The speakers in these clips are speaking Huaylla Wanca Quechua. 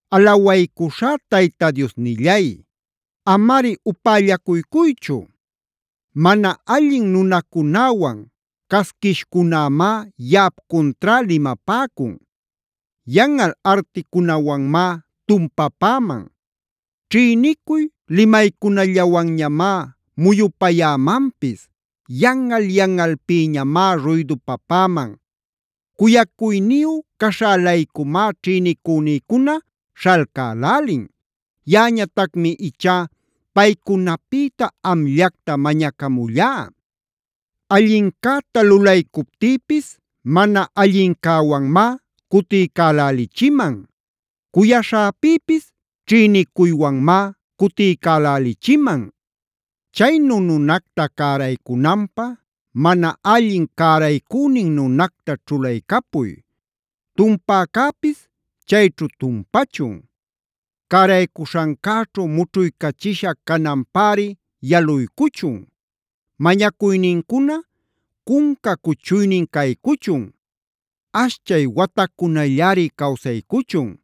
Alawaycuśhá Tayta Diosnillay, amari upällacuycuychu. Mana allin nunacunäwan casquishcunämá yaꞌap cuntrá limapäcun. Yanꞌal articunawanmá tumpapäman. Ćhïnicuy limaycunallawanñamá muyupayämanpis. Yanꞌal-yanꞌalpïñamá ruydupapäman. Cuyacuyniyu caśhä-laycumá ćhïnicünïcuna śhalcälälin. Yaꞌañatacmi ichá paycunapïta amllacta mañacamullá. Allincäta lulaycuptïpis mana allincäwanmá cutiycälälichiman. Cuyaśhäpïpis ćhïnicuywanmá cutiycälälichiman. Chaynu nunacta cäraycunanpä, mana allin cäraycünin nunacta ćhulaycapuy. Tumpäcäpisa chayćhu tumpachun. Cäraycuśhancäćhu mućhuycachisha cananpäri yaluycuchun. Mañacuynincuna cunca cuchuynin caycuchun. Ashchay watacunallañari cawsaycuchun.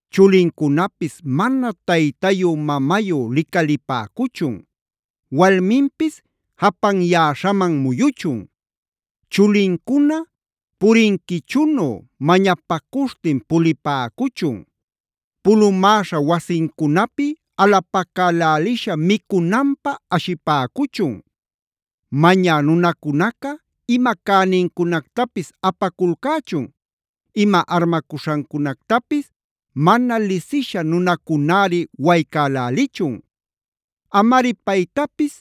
Chulincunapis mana taytayü-mamayü licalipäcuchun. Walminpis japanyäśhaman muyuchun. Chulincuna purinquichunu mañapacuśhtin pulipäcuchun. Pulumäśha wasincunapi alapacälälisha micunanpä ashipäcuchun. Mañä nunacunaca ima cänincunactapis apaculcächun. Ima armacuśhancunactapis mana lisisha nunacunäri waycälälichun. Amari paytapis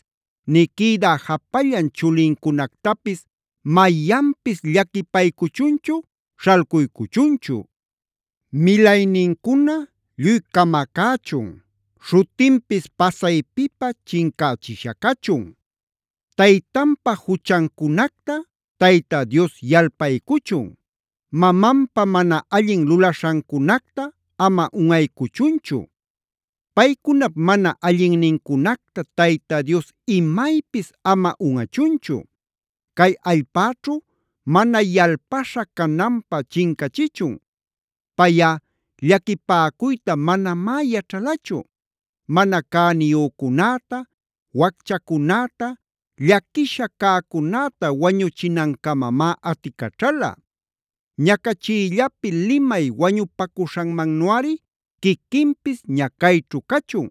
nï quïdä japallan chulincunactapis mayanpis llaquipaycuchunchu, śhalcuycuchunchu. Milaynincuna lluy camacächun. Śhutinpis pasaypipä chincächisha cachun. Taytanpa juchancunacta Tayta Dios yalpaycuchun. Mamanpa mana allin lulaśhancunacta ama unꞌaycuchunchu. Paycunap mana allinnincunacta Tayta Dios imaypis ama unꞌachunchu. Cay allpäćhu mana yalpaśha cananpä chincachichun. Payꞌa llaquipäcuyta manamá yaćhalachu. Mana cäniyücunäta, wacchacunäta, llaquisha cäcunäta wañuchinancamamá aticaćhala. Ñacachiyllapi limay wañupacuśhanmannuꞌari quiquinpis ñacayćhu cachun.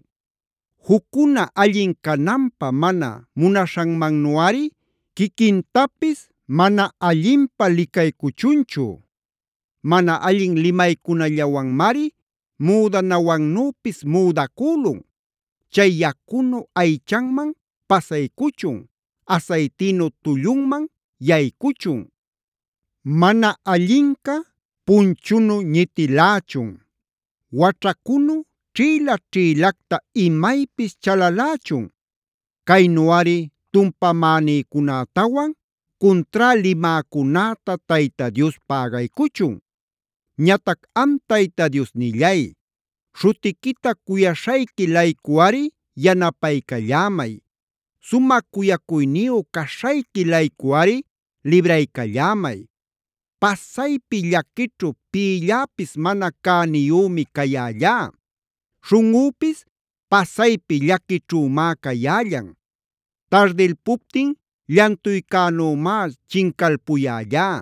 Juccuna allin cananpä mana munaśhanmannuꞌari quiquintapis mana allinpä licaycuchunchu. Mana allin limaycunallawanmari müdanawannüpis müdacülun. Chay yacunu aychanman pasaycuchun, asaytinu tullunman yaycuchun. Mana allinca punchunu ñitilächun. Waćhacunu ćhïla-ćhïlacta imaypis chalalächun. Caynuꞌari tumpamänïcunätawan cuntrá limäcunäta Tayta Dios pägaycuchun. Ñatac am Tayta Diosnillay, śhutiquita cuyaśhayqui-laycuꞌari yanapaycallämay. Sumä cuyacuyniyu caśhayqui-laycuꞌari libraycallämay. Pasaypi llaquićhu pïlläpis mana cäniyümi cayällá. Śhunꞌüpis pasaypi llaquićhümá cayällan. Tardilpuptin llantuycänümá chincalpuyällá.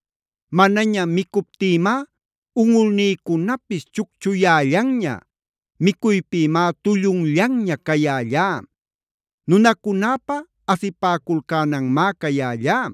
Manaña micuptïmá unꞌulnïcunapis chucchuyällanña. Micuypïmá tullunllanña cayällá. Nunacunäpa asipäculcänanmá cayällá.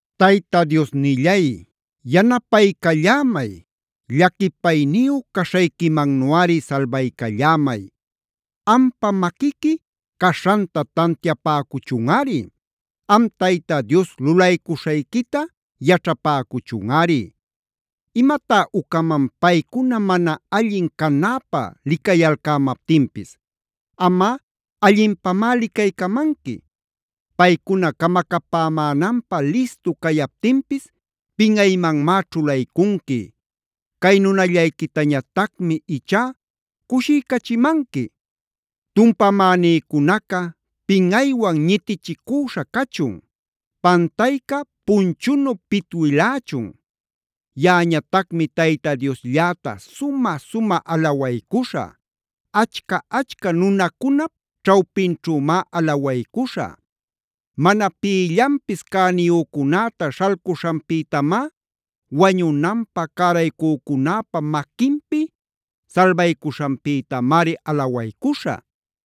Tayta Diosnillay, yanapaycallämay. Llaquipayniyu caśhayquimannuꞌari salbaycallämay. Ampa maquiqui caśhanta tantiapäcuchunꞌari. Am Tayta Dios lulaycuśhayquita yaćhapäcuchunꞌari. ¿Imatá ucaman paycuna mana allin canäpä licayalcämaptinpis? Amꞌa allinpamá licaycamanqui. Paycuna camacapämänanpä listu cayaptinpis pinꞌaymanmá ćhulaycunqui. Cay nunallayquitañatacmi ichá cushiycachimanqui. Tumpamänïcunaca pinꞌaywan ñitichicüśha cachun. Pantayca punchunu pitwilächun. Yaꞌañatacmi Tayta Dioslläta sumä-sumä alawaycuśhä. Achca-achca nunacunap ćhawpinćhümá alawaycuśhä. Mana pïllanpis cäniyücunäta śhalcuśhanpïtamá, wañunanpä cäraycücunäpa maquinpi salbaycuśhanpïtamari alawaycuśhä.